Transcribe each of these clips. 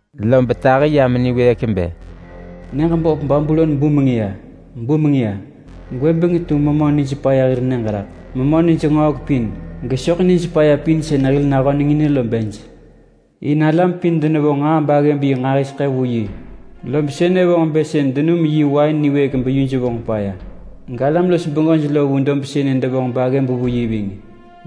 Lob tahi yam niwëëk bë: “Nyëġ böp Babulon bumeng ya! Bumeng ya! Gwëbeng tu memö nij paya hir nyëġ raḳ. Memö nij ngöhek pin, gesoḳ nij paya pin sën hil nahönengin lo bej. In alam pin denevonġ nġaa baggëb yi nġahiseḳë vu yi. Lob sënë vonġ bë sën denum yi wain niwëëk beyuj vonġ paya. Galam-los-bengöj lo vu dob sënë devonġ baggëb vu yi ving.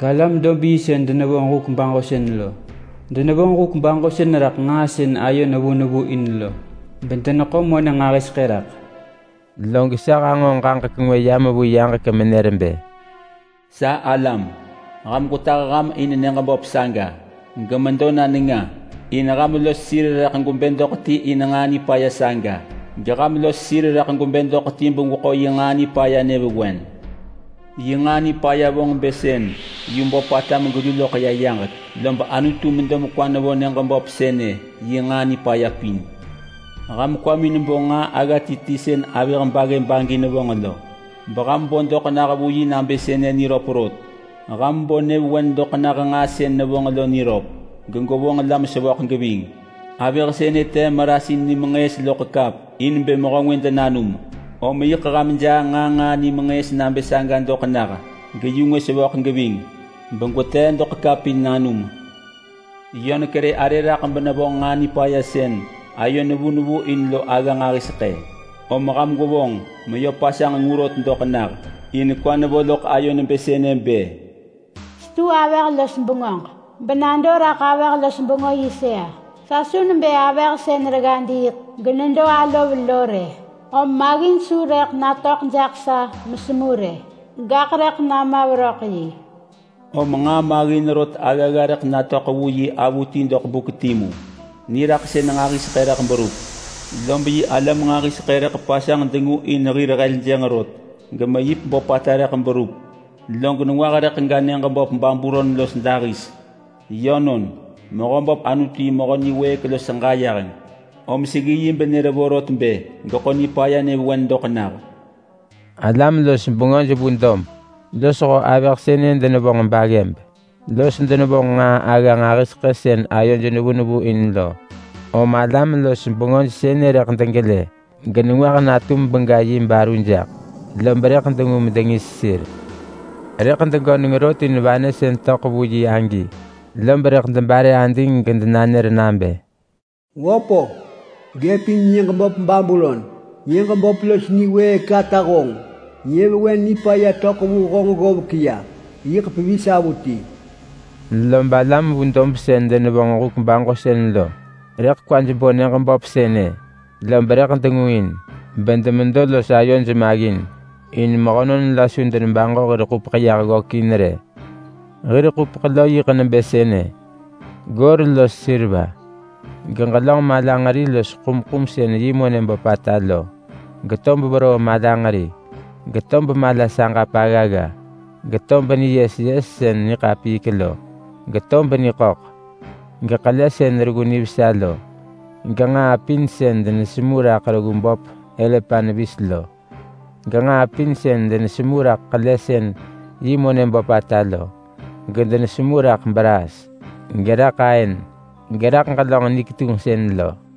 Galam-dob-yi sën denevonġ huk baġosën lo denevonġ huk baġosën raḳ nġaa sën ayo nevu nevu in lo, bedeneḳo monë nġahiseḳë raḳ.” Log sa hanġo ġaġek ngwë yam vu yaġek menër bë: “Sa alam, ham gwetah ham in nyëġ böp saga. Ġemedo na nenga. In ham los sir rëḳ gwebë doḳ ti in yi nġaa nipaya saga. Geham los sir rëḳ gwebë doḳ ti begweḳo yi nġaa nipaya nyëvewen. Yi nġaa nipaya vonġ bë sën yu böpata megelu loḳ ya yaġek. Lob Anutu medo mekwa nevo nyëġ böp sënë yi nġaa nipaya pin. Ham kwamin bo nġaa agga ti ti sën avëh baggëb agi nevonġ lo, beham bo doḳ nah vu yi nabë sënë niröp rot. Ham bo nyëvewen doḳ nah nġaa sën nevonġ lo niröp, gegwevonġ la mesevöḳ geving. Avëh sënë tee marasin nimenġëës loḳ kap in bë mehö ngwë denanum, om yiḳ ham jaa nġaa nġaa nimenġëës nabë saga doḳ nah, geyu ngwë sevöḳ geving begwetee doḳ kap in nanum. Yö nekerë arë raḳ benevonġ nġaa nipaya sën ayo nevu nevu in lo agga nġahiseḳë. Om ham gwevonġ meyö pasanġ ngu rot doḳ nah. In kwa nevo loḳ ayo nebë sënë bë, ‘Setu avëh-los-bengöġ benado raḳ avëh-los-bengö yi sëa. Sa su nebë avëh sën regga diiḳ genedo alov lo rë. Om maggin su rëḳ natöḳ jaḳ sa mesengu rë, gaḳ rëḳ nama veröḳ yi.’ Om nġaa maggin rot aggagga rëḳ natöḳ vu yi avuti doḳ buk timu. Niraḳsën nġahiseḳë rëḳ berup, lob yi alam nġahiseḳë rëḳ pasanġ dengu in hir heljënġ rot, gemeyip böpata rëḳ berup. Log nengwah rëḳ ga nyëġ böp Babulon los dahis. Yönon, Mehöböp Anutu yi mehö niwëëk los ġayeheng, om seggi yi benër vorot bë geḳo nipaya nyëvewen doḳ nah. Alam-los-bengöj vu dob losho avëh sënë denevonġ baggëb los denevonġ nġaa agga nġahiseḳë sën ayoj nevu nevu in lo. Om alam-los-bengöj sënë rëḳ degelë genengwah natum bega yi baru jaḳ, lob rëḳ dengu medengis sir. Rëḳ degöneng rot in vanë sën töḳ vu yi agi, lob rëḳ debare ading gedenanër nabë: ‘Wöp-o, gëpin nyëġ böp Babulon! Nyëġ böp los niwëëk ata honġ! Nyëvewen nipaya töḳ vu honġ ggovek ya yiḳ pevis avuti!’ Lob alam vu dob sën denevonġ huk baġosën lo rëḳ kwaj bo nyëġ böp sënë, lob rëḳ dengu in, bedemedo los ayoj maggin. In mehönon la su denebaġo hir ḳupeḳ yah ggökin rë. Hir ḳupeḳ lo yiḳ nebë sënë: Goor los seriva, geġelönġ malanġeri los ḳumḳum sën yi monë böpata lo, getob veroo malanġeri, getob mala saġap aggagga, getob niyes yes sën niḳapiik lo, gejerujeng navi, geḳele sën reggu nivesa lo, genġaa pin sën denesemu raḳ reggu böp elepant vis lo, genġaa pin sën denesemu raḳ ḳele sën yi monë böpata lo, gedenesemu raḳ braas, geraḳ aën geraḳ ġelönġ ni ketunġsën lo.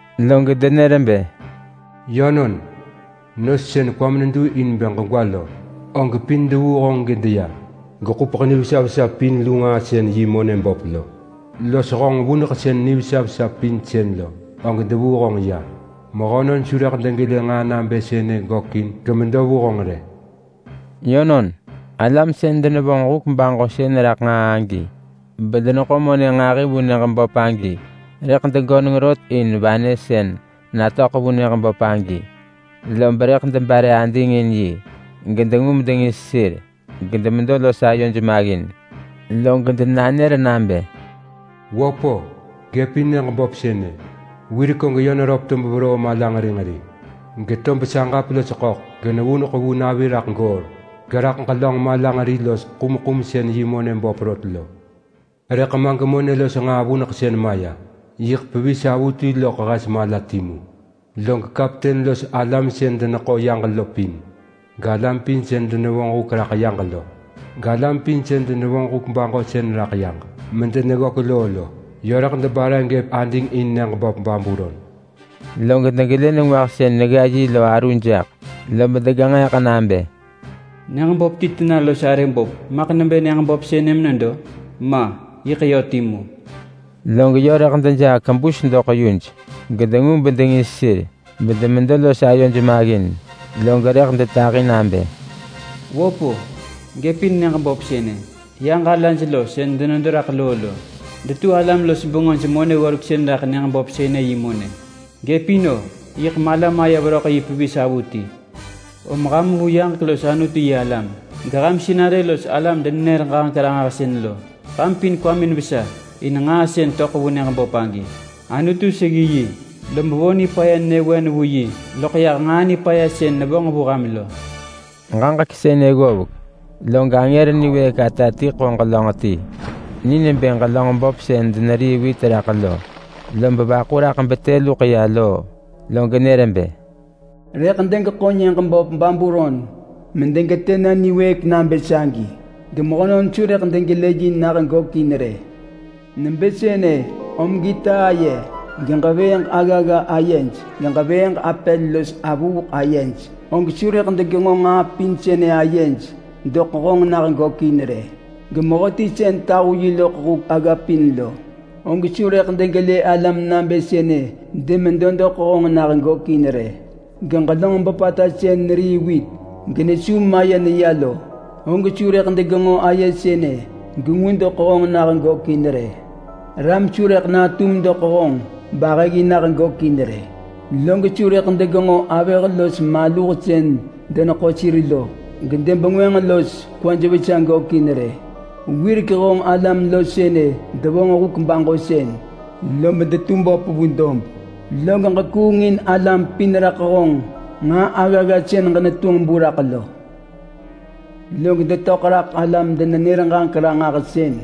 Log denër bë, ‘Yönon, nos sën kwam nedu in bë ġegwa lo, og pin devuu honġ gedeya. Geḳupeḳ nivesa vesa pin lu nġaa sën yi monë böp lo, los honġ vuneḳsën nivesa vesa pin sën lo, og devuu honġ ya. Mehönon su rëḳ degelë nġaa nabë sënë gökin gemedo vu honġ rë!’ Yönon, alam sën denevonġ huk baġosën raḳ nġaa agi, bedeneḳo monë nġahi vu nyëġ böp agi rëḳ degöneng rot in vanë sën natöḳ vu nyëġ böp agi, lob rëḳ debare ading in yi gedengu medengis sir, gemedo los ayoj maggin. Log denanër nabë: ‘Wöp-o, gëpin nyëġ böp sënë! Wirek og yö neröp tob veroo malanġeri nġeri, getob saġap los ḳöḳ, genevuneḳ vu navi raḳ goor, geraḳ ġelönġ malanġeri los ḳumḳum sën yi monë böp rot lo. Rëḳ ma gemonë sënë los ḳupeḳ gevuneḳ vuneḳ bemalaj maya yiḳ pevis avuti.’ Log kapten los alam sën deneḳo yaġ lo pin, galam pin sën denevonġ huk raḳ yaġ lo, galam pin sën denevonġ huk baġosën raḳ yaġ medeneggök loo lo, yö rëḳ debare gëp ading in nyëġ böp Babulon. Log degelë nengwah sën negga yi lo aru jaḳ, lob degenġeeḳ nabë, ‘Nyëġ böp ti tena los arë böp maḳ nebë nyëġ böp sënë menedo? Ma! Yiḳ yö timu!’ Log yö rëḳ dejaa kebus doḳ yuj, gedengu bedengis sir bedemedo los ayoj maggin. Log rëḳ detahi nabë: ‘Wöp-o, gëpin nyëġ böp sënë! Yaġ alaj lo sën denedo raḳ loo lo detu alam-los-bengöj-monë-ggoreksën raḳ nyëġ böp sënë yi monë. Gëpin-o! Yiḳ mala maya veröḳ yi pevis avuti! Om ham vu yaġek los Anutu-yi-alam, geham sinarë los alam-denenër-ġaġek-ranġahsën lo! Ham pin kwamin vesa in nġaa sën töḳ vu nyëġ böp agi. Anutu seggi yi, lob vo nipaya nyëvewen vu yi loḳ yah nġaa nipaya sën nevonġ vu ham lo.’” Ġaġek sënë ggovek, log angër niwëëk ata ti ḳo ġelönġ ti ni nebë ġelönġ böp sën denerii wit raḳ lo, lob vaḳu raḳ betë luḳ ya loo, log nër bë: “Rëḳ degeḳo nyëġ böp Babulon medegetë na niwëëk nabë sagi, gemehönon su rëḳ degelë yi nah gökin rë. Nebë sënë om gita aye, geġevëëġ aggagga ayej, geġevëëġ apel los avuuḳ ayej, og su rëḳ degenġo nġaa pin sënë ayej doḳ honġ nah gökin rë. Gemehöti sën tahu yi loḳ huk agga pin lo, og su rëḳ degelë alam nabë sënë demedo vu honġ nah gökin rë. Geġelönġ böpata sën nerii wit genesu maye neya lo, og su rëḳ degenġo aye sënë gengu doḳ honġ nah gökin rë. Ram su rëḳ natum doḳ honġ bahëġgi nah gökin rë. Log su rëḳ degenġo avëh los maluh sën deneḳo sir lo gedebengwënġ los kwaj vesa gökin rë. Wirek honġ alam lo sënë devonġ huk baġosën, lob detu böp vu dob. Log ġekuung in alam pin raḳ honġ nġaa aggagga sën ġenetunġ bu raḳ lo. Log detöḳ raḳ alam-denenër-ġaġek-ranġahsën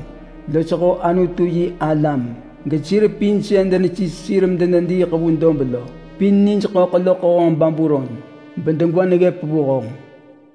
losho Anutu-yi-alam gesir pin sën denesis sir medenediiḳ vu dob lo pin nij ḳöḳ loḳ honġ Babulon, bedegwa neggëp vu honġ.”